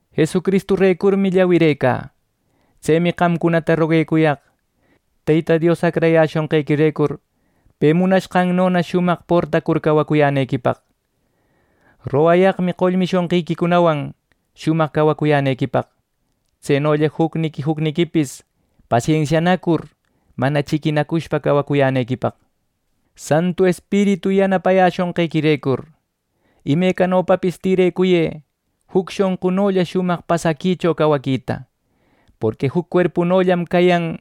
Jesucristurecurmi llawirecä. Tsemi qamcunata roguecuyaq Teyta Dios acrayäshonqequirecur, pe munashqannona shumaq portacur cawacuyänequipaq. Rogayaqmi qollmi shonqiquicunawan shumaq cawacuyänequipaq. Tsenolla jucniqui jucniquipis pasensianacur mana chiquinacushpa cawacuyänequipaq. Santu Espiritu yanapayäshonqequirecur, imecanopapis tïrecuyë juc shonqunolla shumaq pasaquicho cawaquita. Porqui juc cuerpunollam cayan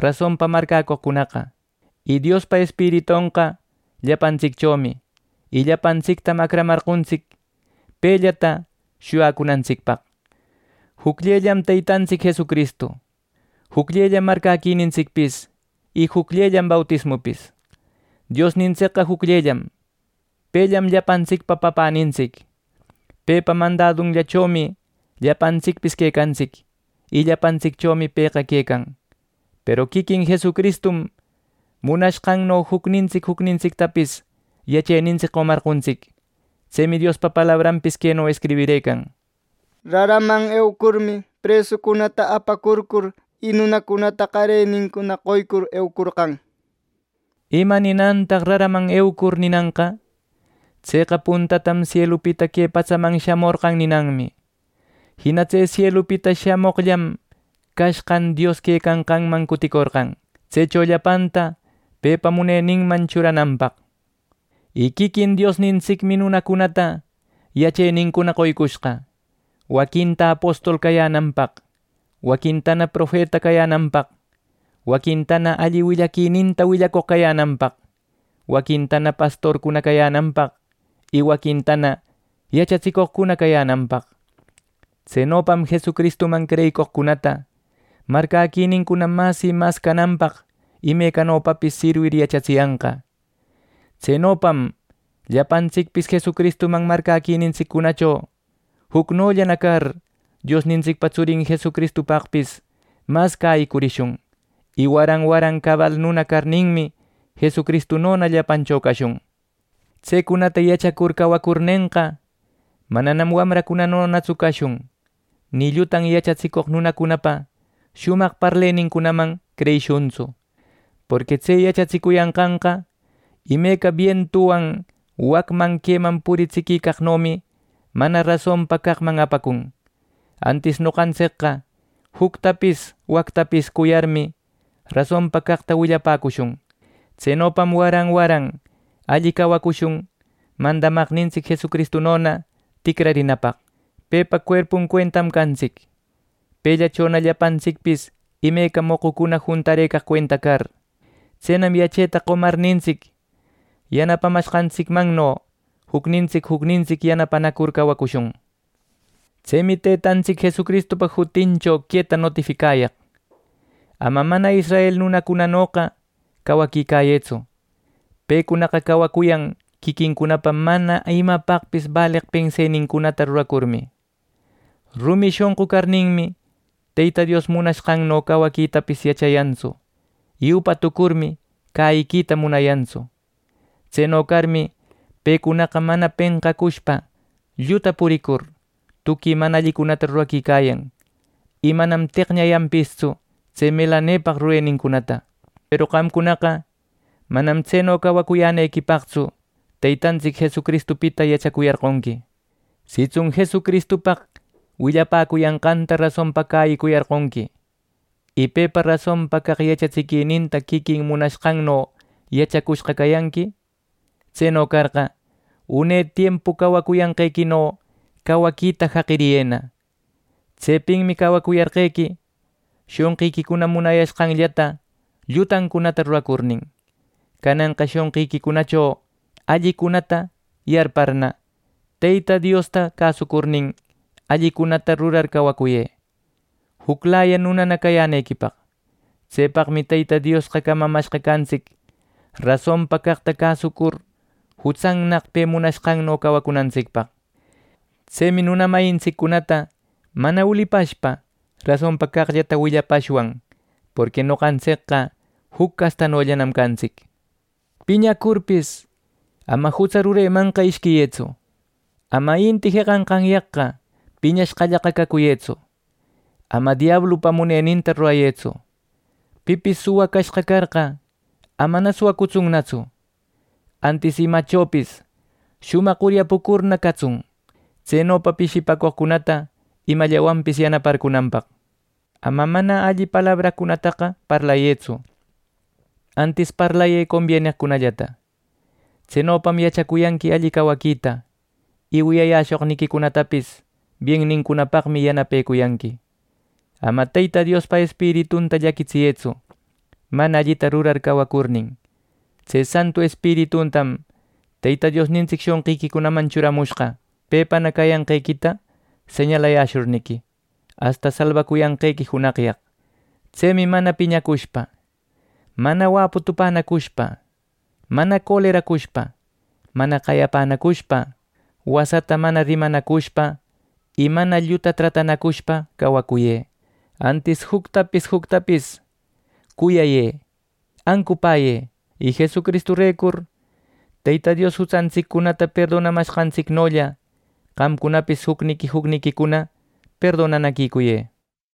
rasonpa marcäcoqcunaqa, y Diospa Espiritonqa llapantsicchomi, y llapanstictam acramarqontsic pellata shuyacunantsicpaq. Jucllellam Teytantsic Jesucristu, jucllellam marcäquinintsicpis y jucllellam bautismupis. Diosnintsicqa jucllellam, pellam llapantsicpa Papänintsic, pepa mandadunllachomi llapantsicpis quecantsic, y llapantsicchomi pëqa quecan. Peru quiquin Jesucristum munashqanno jucnintsic jucnintsictapis yachenintsic qomarqontsic. Tsemi Diospa palabranpis queno escribirëcan: “Raraman eucurmi, presucunata apacurcur, y nunacunata qarenincuna qoycur eucorqan” nir. ¿Ima ninantaq “raraman eucur” ninanqa? Tseqa puntatam sielupita que patsaman shamorqan ninanmi. Jina tse sielupita shamoqllam cashqan Dios quecanqanman cuticorqan tsecho llapanta pepa muneninman churananpaq. Y quiquin Diosnintsicmi nunacunata yachenincuna qoycushqa: waquinta apostol cayänanpaq, waquintana profeta cayänanpaq, waquintana alli willaquininta willacoq cayänanpaq, waquintana pastorcuna cayänanpaq y waquintana yachatsicoqcuna cayänanpaq. Tsenopam Jesucristuman creyicoqcunata marcäquinincuna mas y mas cananpaq imecanopapis sirwir yachatsiyanqa. Tsenopam llapantsicpis Jesucristuman marcäquinintsiccunacho jucnollana car Diosnintsicpa tsurin Jesucristupaqpis mas cäyicurishun, y waran waran cabal nuna carninmi, Jesucristunona llapancho cashun. Tsecunata yachacur cawacurnenqa, mananam wamracunanotsu cashun. Ni llutan yachatsicoq nunacunapa shumaq parleninman creyishuntsu, porqui tse yachatsicuyanqanqa imeca bientuwan wacman queman puritsiquicaqnomi mana rasonpa caqman apacun. Antis noqantsicqa juctapis wactapis cuyarmi, rasonpa caqta willapäcushun. Tsenopam waran waran alli cawacushun mandamaqnintsic Jesucristunona ticrarinapaq. Pepa cuerpun cuentam cantsic, pellachona llapantsicpis imeca moqucuna juntarëcaq cuenta car. Tsenam yacheta qomarnintsic, yanapamashqantsicmanno jucnintsic jucnintsic yanapanacur cawacushun. Tsemi Teytantsic Jesucristupa jutincho queta notificayaq: Ama mana israel nunacunanoqa cawaquicayëtsu. Pecunaqa cawacuyan quiquincunapa mana imapaqpis baleq pensenincunata ruracurmi. Rumi shonqu carninmi, Teyta Dios munashqanno cawaquitapis yachayantsu, y upa tucurmi cäyiquita munayantsu. Tseno carmi, pecunaqa mana penqacushpa lluta puricur, tuqui mana allicunata ruraquicayan, y manam teqñayanpistsu tse melanepaq rurenincunata. Peru qamcunaqa manam tseno cawacuyänequipaqtsu Teytantsic Jesucristupita yachacuyarqonqui. Sitsun Jesucristupaq willapäcuyanqanta rasonpa cäyicuyarqonqui, y pepa rasonpa caq yachatsiquininta quiquin munashqanno yachacushqa cayanqui, tseno carqa, une tiempu cawacuyanqequino cawaquita jaqiriyëna. Tsepinmi cawacuyarqequi shonqiquicuna munashqanllata llutancunata ruracurnin. Cananqa shonqiquicunacho allicunata yarparna, Teyta Diosta cäsucurnin, allicunallatana rurar cawacuyë juclaya nunana cayänequipaq. Tsepaqmi Teyta Diosqa camamashqa cantsic rasonpa caqta cäsucur jutsannaq pe munashqanno cawacunantsicpaq. Tsemi nuna mayintsiccunata mana ulipashpa rasonpa caqllata willapashwan; porqui noqantsicqa juc castanollanam cantsic. Piñacurpis, ama jutsa ruremanqa ishquiyëtsu. Ama inti jeqanqanyaqqa piñashqallaqa cacuyëtsu. Ama diablupa muneninta rurayëtsu. Pipis suwa cashqa carqa, amana suwacutsunnatsu; antis imallachopis shumaq uryapucurna catsun, tsenopa pishipaqcunata imallawanpis yanaparcunanpaq. Ama mana alli palabracunataqa parlayëtsu; antis parlayë combieneqllata. Tsenopam yachacuyanqui alli cawaquita; y wiyayäshoqniquicunatapis bienincunapaqmi yanapecuyanqui. Ama Teyta Diospa Espiritunta llaquitsiyëtsu ˻mana allita rurar cawacurnin˼. Tse Santu Espiritutam Teyta Diosnintsic shonqiquicunaman churamushqa pepana cayanqequita señalayäshurniqui, asta salbacuyanqequi junaqyaq. Tsemi mana piñacushpa, mana wäputupänacushpa, mana coleracushpa, mana qayapänacushpa, wasata mana rimanacushpa y mana lluta tratanacushpa cawacuyë. Antis juctapis juctapis cuyayë, ancupäyë; y Jesucristurecur Teyta Dios jutsantsiccunata perdonamashqantsicnolla qamcunapis jucniqui jucniquicuna perdonanaquicuyë.